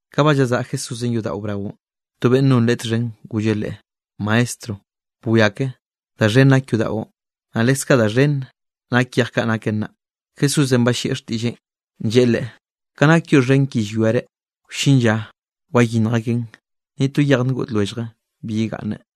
Ka ba llazaꞌa Jesúsenꞌ yodaꞌo braonꞌ, to beꞌnn nonꞌ Leꞌe txhen golleꞌ Leꞌe: —¡Maestro, bwia ke da xhen nak yodaꞌon, naꞌ leskaꞌ da xhen nak yej kaꞌ naken naꞌ! Jesúsenꞌ ballieꞌ xtiꞌlleꞌn, lleꞌe leꞌe: —Ka nak yoꞌ xhen ki llwiare, wllin lla wayinnj akeꞌn, ni to yej ngoꞌd lwellje bi yegaꞌnne.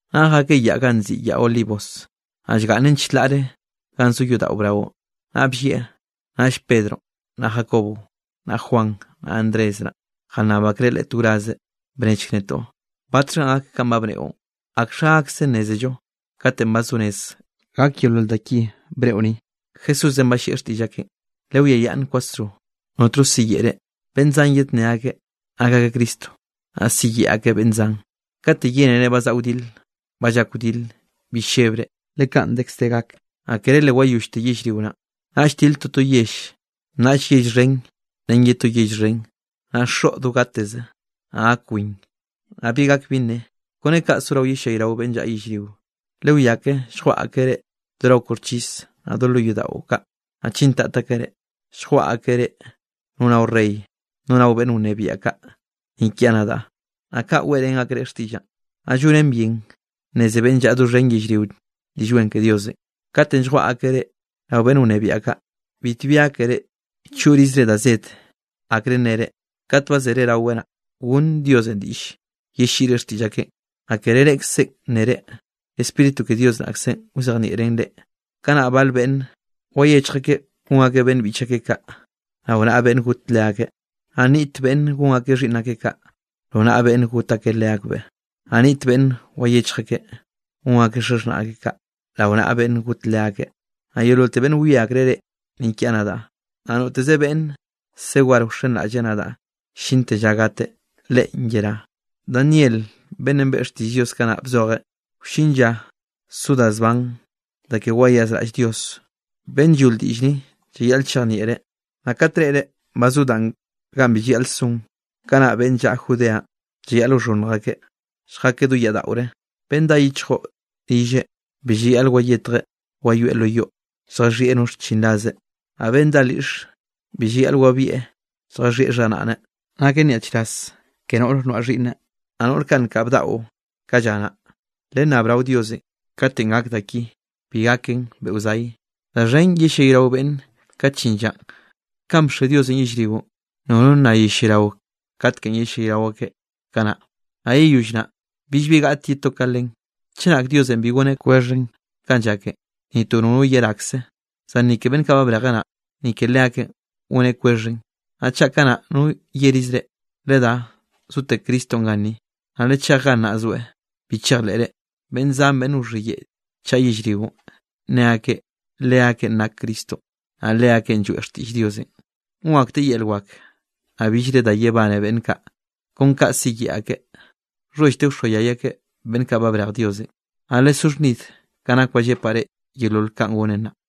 Naꞌ jakeꞌ yaꞌ ganꞌ nziꞌi Yaꞌ Olivos, naꞌ llgaꞌnnen chlaꞌ ganꞌ zo yodaꞌo braonꞌ, naꞌ bllieꞌ, naꞌll Pedronꞌ naꞌ Jacobo, naꞌ Juan, naꞌ Andrés naꞌ, jannab akreꞌ Leꞌe to wraze: —Bnechk netoꞌ, ¿batxhanꞌ gak kanꞌ ba bneꞌon? ¿Akxha gakze nnézello katenꞌ ba zo rez gak yeolol da ki bneꞌo ni? Jesúsenꞌ ballieꞌ xtiꞌll akeꞌn: —Lewiayaꞌnn kwasro, notno siyeꞌe reꞌ. Beꞌnn zan yednné akeꞌ nak akeꞌ Cristo. Naꞌ siyeꞌe akeꞌ beꞌnn zan. ’Kate yénere ba zaꞌa wdile, ba llak wdile, bi llebre, le kaꞌn dekz de gak, naꞌ kere le wayollte yellrio naꞌn. Naꞌll tile toto yell, naꞌll yell xhen ren ye to yell xhen, naꞌ xoꞌ do gateze, naꞌ gak win, naꞌ bi gak bi nne, kone kaꞌ sorao yellayrao beꞌnne llaꞌa yellrio. ’Lewiake, lljwaꞌa akeꞌ reꞌ do rao koxchis, naꞌ do lo yodaꞌo kaꞌ, naꞌ chintat akeꞌ reꞌ, lljwaꞌa akeꞌ reꞌ no rao rey, no rao beꞌnn wnebiaꞌ kaꞌ ni kiaꞌ nadaꞌ, naꞌ kaꞌn weꞌrén akreꞌ xtiꞌllaꞌ. Naꞌ llonen bien nneze beꞌnn llaꞌa doxhen yellrio Diꞌll Wen ke Diosenꞌ. Katenꞌ lljwaꞌa akeꞌ reꞌ rao beꞌnn wnebiaꞌ kaꞌ, bitbi gákere choꞌrizre da zed akre nnere. Kat ba zere rawe naꞌ, gonn Diosenꞌ diꞌll yelliꞌre xtiꞌll akeꞌn, naꞌ kere reꞌkzenꞌ nnere, Spíritu ke Dios naꞌkzenꞌ wzejnieꞌn reꞌ. Kanaꞌ bal beꞌnn wayechj akeꞌ gon akeꞌ beꞌnn biꞌch akeꞌ kaꞌ, rao naꞌa beꞌnn got leakeꞌ, naꞌ nniꞌt beꞌnn gon akeꞌ xhiꞌnn akeꞌ kaꞌ, rao naꞌa beꞌnn got akeꞌ leakbeꞌ, naꞌ nniꞌt beꞌnn wayechj akeꞌ gon akeꞌ xaxhnaꞌ akeꞌ kaꞌ, rao naꞌa beꞌnn got leakeꞌ. Naꞌ yeololte beꞌnn wie akreꞌ reꞌ ni kiaꞌ nadaꞌ, naꞌ noteze beꞌnn se war wxenraꞌlleꞌ nadaꞌ llinte lla gateꞌ, leꞌen yerá. ’Daniel beꞌnnenꞌ beꞌe xtiꞌll Dios kanaꞌ bzojeꞌ, wllin lla so da zban da ke wayazraꞌll Dios. (Beꞌnn llol diꞌll ni llayaꞌl chejnieꞌreꞌ.) Naꞌ kat reꞌre ba zo danꞌ ganꞌ bi llayaꞌl son, kanaꞌ beꞌnn llaꞌa Judeanꞌ llayaꞌl wxhonnj akeꞌ lljakeꞌ do yaꞌ daꞌore. Beꞌnn dá yichjo rilleꞌ, bi llayaꞌl wayetjeꞌ wayoeꞌ lo yoꞌ, lljaxhieꞌ no xchinrazeꞌ. Naꞌ beꞌnn dá lyiꞌxe, bi llayaꞌl wabieꞌ lljaxhiꞌi xharaꞌneꞌ. Naken nyaꞌchraz ke noꞌr noaꞌ xhiꞌnne, naꞌ noꞌr kaꞌ nkaꞌ bdaꞌo ka lla naꞌ. Lennab rao Dios katenꞌ gak da ki bi gaken beꞌo zay. Da xhen yellayrao beꞌnne kate llin llanꞌ, kanꞌ bxe Diosenꞌ yellrio nono nna yellayrao katekenꞌ yellayrao akeꞌ kanaꞌ, naꞌ yeyoll naꞌ, billbi gaꞌte ye to ka len. Chenak Diosenꞌ bi goneꞌ kwexhen kanꞌ llaken, ni to nono yerakze, zan ni ke beꞌnn kaꞌ ba brejeꞌ naꞌ, ni ke leakeꞌn goneꞌ kwexhen. ’Naꞌ chaꞌ kanaꞌ, no yerize reꞌ: “Ledá, zote Cristonꞌ ganni”, naꞌ “Lechej gannaꞌ zoeꞌ”, bi chejleꞌre. Beꞌnn zan beꞌnn wxhiyeꞌe chaꞌa yellrionꞌ, nne akeꞌ leakeꞌn nak Cristonꞌ, naꞌ leakeꞌn lloeꞌ xtiꞌll Diosenꞌ. Gon akteꞌ yel wak, naꞌ billre da yebane beꞌnn kaꞌ kon ka siyeꞌe akeꞌ, nxhollte wxoayay akeꞌ beꞌnn kaꞌ ba brej Diosenꞌ. Naꞌ lesó xhnid ka nak ba llepaꞌ reꞌ yeolol kanꞌ gonen nnaꞌ.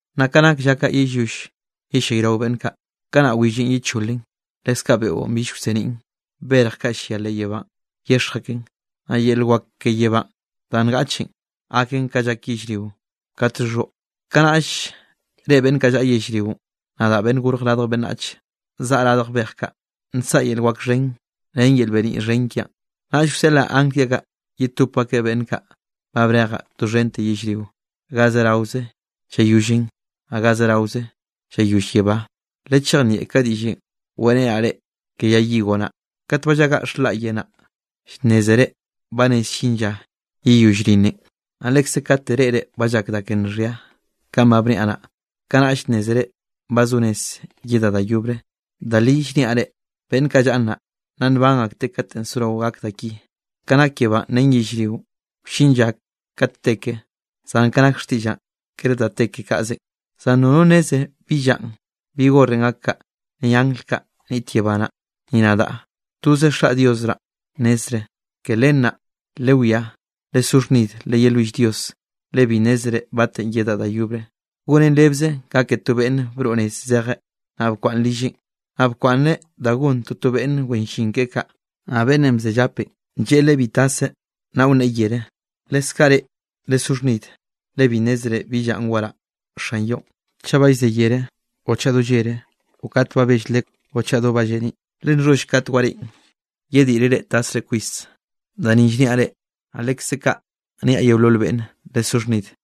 ’Naꞌ ka nake lla ka yeyoll yellayrao beꞌnn kaꞌ, kanaꞌ willenꞌ yecholen, leskaꞌ beꞌon bill wseniꞌn. Berj kaꞌ llia leꞌ yebánꞌ yexj aken, naꞌ yel wak ke yebánꞌ danꞌ ngaꞌchen, gaken ka llak yellrionꞌ kat llxhoꞌ. Kanaꞌll reꞌe beꞌnn kaꞌ llaꞌa yellrionꞌ nadaꞌ, Beꞌnnenꞌ Gorj Radj Beꞌnnachenꞌ, zaꞌa radj bej kaꞌ nsaꞌa yel wak xhen ren yel beniꞌ xhen kiaꞌn. Naꞌll wseꞌlaꞌ angl kiaꞌ kaꞌ, yetop akeꞌ beꞌnn kaꞌ ba brejaꞌ doxhente yellrio, ga zeraoze llayollen, naꞌ ga zeraoze llayoll yebá. ’Lechejnieꞌ ka diꞌllenꞌ weꞌrenaꞌ reꞌ ke yay higo naꞌ: Kat ba llagaꞌ xhlaꞌye naꞌ, llnnézere ba rez llin lla yeyoꞌllo rinne. Naꞌ lekze kate reꞌre ba llak da ke nxhia kanꞌ ba bniaꞌ naꞌ, kanaꞌll nnézere ba zo rez yedaꞌ da yobre. Da li llniaꞌ reꞌ, beꞌnn kaꞌ llaꞌa nnaꞌ, nna nban akteꞌ kate sorao gak da ki. Ka nak yebánꞌ ren yellrionꞌ wllin lla kat te ke, zan ka nak xtiꞌllaꞌn kere da te ke kaꞌzenꞌ. ’Zan nono nneze bi llanꞌ, bi horenꞌ gak kaꞌ, ni angl kaꞌ niꞌt yebá naꞌ, ni nadaꞌ. Toze Xaꞌ Dios naꞌ nnezreꞌ. ’Ke len naꞌ, lewiá, lesó xhnid, leyelwill Dios, le bi nnézere batenꞌ yedaꞌ da yobre. Gonen rebze ka ke to beꞌnne broꞌ nez zejeꞌ, naꞌ bkwaꞌnn rilleꞌ, naꞌ bkwaꞌnneꞌ da gon toto beꞌnn wen llin keꞌe kaꞌ, naꞌ beꞌnnenꞌ bze llapenꞌ, lleꞌe leꞌe bi taseꞌ, naꞌ wnneꞌe yere. Leskaꞌ reꞌ, lesó xhnid, le bi nnézere bi llanꞌ waraꞌ xan yoꞌn, chaꞌ ba llze yere o chaꞌ do llere o kat ba bell lekw o chaꞌ do ba lleniꞌ. Le nxholl kate wareꞌen, yeddiꞌreꞌ reꞌ tasre kwis. Da ni llniaꞌ reꞌ, naꞌ lekze kaꞌ niaꞌ yeolol beꞌnne; lesó xhnid.